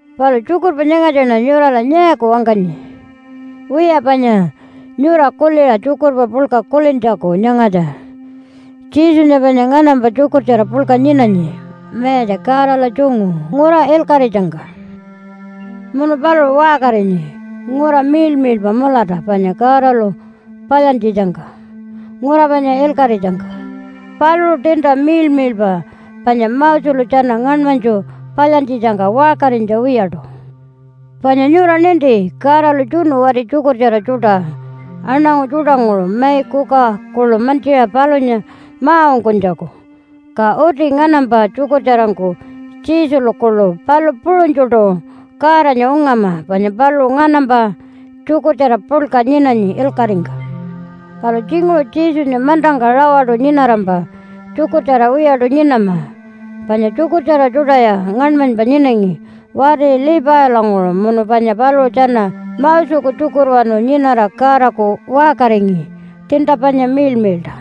Palu tjukurpa nyangatjaṉa nyurala nyaaku wangkanyi? Wiya panya nyura kuliṟa tjukurpa puḻka kulintjaku nyangatja Jesunya panya nganampa tjukurtjara puḻka nyinanyi Mayatja Godala tjungu ngura ilkaṟitjangka. Munu paluṟu waṟkarinyi ngura miḻmiḻpa mulata panya Godalu palyantjitjangka ngura panya ilkaṟitjangka. Paluṟu tiinta miḻmiḻpa panya Moselu tjana ngaṉmanytju palyantjitjangka waṟkarinytja wiyaṯu. Panya nyura ninti Godalu tjunu wati tjukurtjara tjuṯa aṉangu tjuṯanguṟu mai kuka kuḻu mantjiṟa palunya ma-ungkunytjaku. Ka uti nganampa tjukurtjarangku Jesulu kuḻu palu puṟunytjuṯu Godanya ungama panya paluṟu nganampa tjukurtjara puḻka nyinanyi ilkaṟingka. Palu tjinguṟu Jesunya mantangka rawaṯu nyinarampa tjukurtjara wiyaṯu nyinama, panya tjukurtjara tjuṯaya ngaṉmanypa nyinangi wati Levilanguṟu munu panya paluṟu tjana Moseku tjukurwanu nyinara Godaku waṟkaringi tiinta panya miḻmiḻṯa.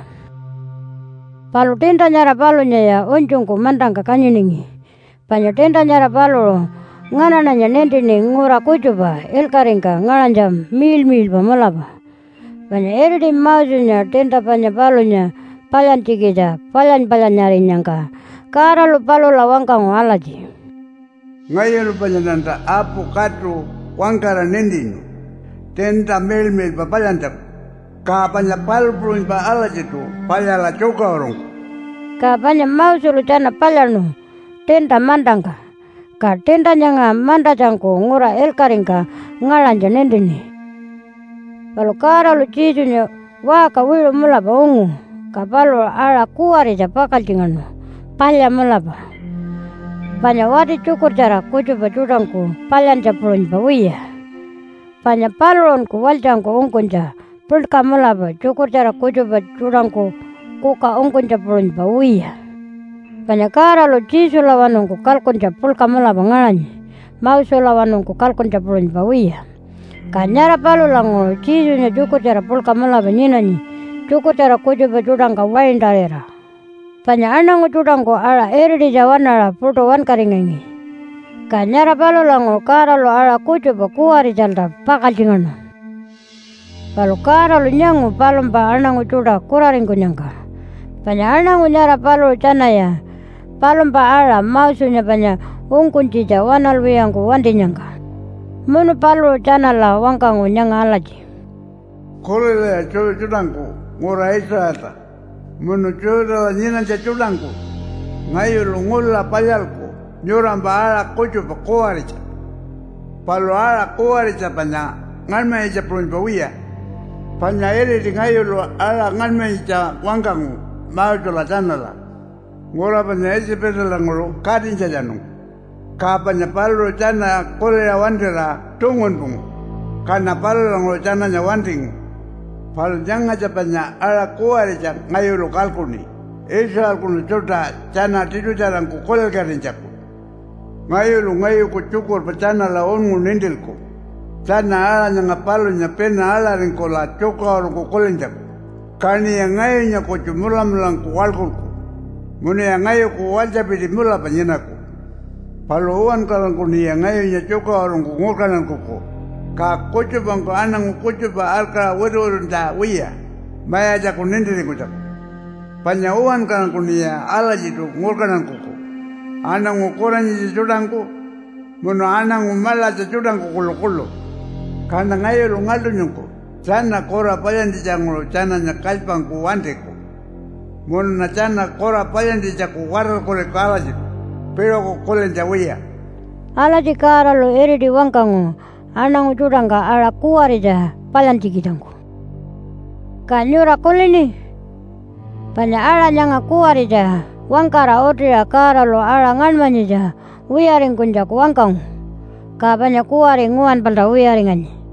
Palu tiinta nyara palunyaya unytjungku mantangka kanyiningi. Panya tiinta nyara paluṟu nganaṉanya nintini ngura kutjupa ilkaṟingka ngaṟanytja miḻmiḻpa mulapa. Panya iriti Mosenya tiinta panya palunya palyantjikitja palyany-palyanyarinyangka Godalu palula wangkangu alatji, “Ngayulu panyaṉanta apu katu wangkara nintinu tiinta miḻmiḻpa palyantjaku. Ka panya palu puṟunypa alatjiṯu palyala tjukaṟurungku.” Ka panya Moselu tjana palyaṉu tiinta mantangka, ka tiinta nyanga mantatjangku ngura ilkaṟingka ngaṟanytja nintini. Palu Godalu Jesunya waṟka wiṟu mulapa ungu, ka paluṟu aṟa kuwaritja pakaltjingaṉu palya mulapa, panya wati tjukurtjara kutjupa tjuṯangku palyantja puṟunypa wiya. Panya paluṟunku walytjangku ungkunytja puḻka mulapa tjukurtjara kutjupa tjuṯangku kuka ungkunytja puṟunypa wiya. Panya Godalu Jesulawanungku kalkuntja puḻka mulapa ngaṟanyi, Moselawanungku kalkuntja puṟunypa wiya. Ka nyara palulanguṟu Jesunya tjukurtjara puḻka mulapa nyinanyi tjukurtjara kutjupa tjuṯangka waintarira. Panya aṉangu tjuṯangku aṟa irititja waṉaṟa puṯu wankaringangi. Ka nyara palulanguṟu Godalu aṟa kutjupa kuwaritjalta pakaltjingaṉu. Palu Godalu nyangu palumpa aṉangu tjuṯa kuraringkunyangka, panya aṉangu nyara paluṟu tjanaya palumpa aṟa Mosenya panya ungkunytjitja waṉalwiyangku wantinyangka. Munu paluṟu tjanala wangkangu nyanga alatji, “Kulilaya Jew tjuṯangku ngura Israelta munu Judah-la nyinanytja tjuṯangku! Ngayulu ngula palyalku nyurampa aṟa kutjupa kuwaritja. Palu aṟa kuwaritja panya ngaṉmanyitja puṟunypa wiya. Panya iriti ngayulu aṟa ngaṉmanyitja wangkangu Mosela tjanala ngura panya Itjipalanguṟu katinytjatjanungku. Ka panya paluṟu tjana kuliṟa wantira tungunpungu, kaṉa palulanguṟu tjananya wantingu. Palu nyangatja panya aṟa kuwaritja ngayulu kalkuṉi Israelkunu tjuṯa tjana tiṯutjarangku kulilkatinytjaku. Ngayulu ngayuku tjukurpa tjanala unngu nintilku tjana aṟa nyanga palunya pina aḻaringkula tjukaṟurungku kulintjaku. Kaṉiya ngayunya kutju mulamulangku waḻkulku munuya ngayuku walytjapiti mulapa nyinaku. Palu uwankarangkuṉiya ngayunya tjukaṟurungku ngurkantankuku, ka kutjupangku aṉangu kutjupa arkaṟa wituwituntja wiya Mayatjaku nintiringkunytjaku. Panya uwankarangkuṉiya alatjiṯu ngurkantankuku, aṉangu kuranyitja tjuṯangku munu aṉangu maḻatja tjuṯangku kuḻukuḻu. Kaṉa ngayulu ngaḻṯunytjungku tjana kura palyantjitjanguṟu tjananya kalypangku wantiku, munuṉa tjana kura palyantjitjaku watarkuriku alatjiṯu piṟuku kulintja wiya.” Alatji Godalu iriti wangkangu aṉangu tjuṯangka aṟa kuwaritja palyantjikitjangku. Ka nyura kulini? Panya aṟa nyanga kuwaritja wangkara utiṟa Godalu aṟa ngaṉmanyitja wiyaringkunytjaku wangkangu, ka panya kuwari nguwanpalta wiyaringanyi.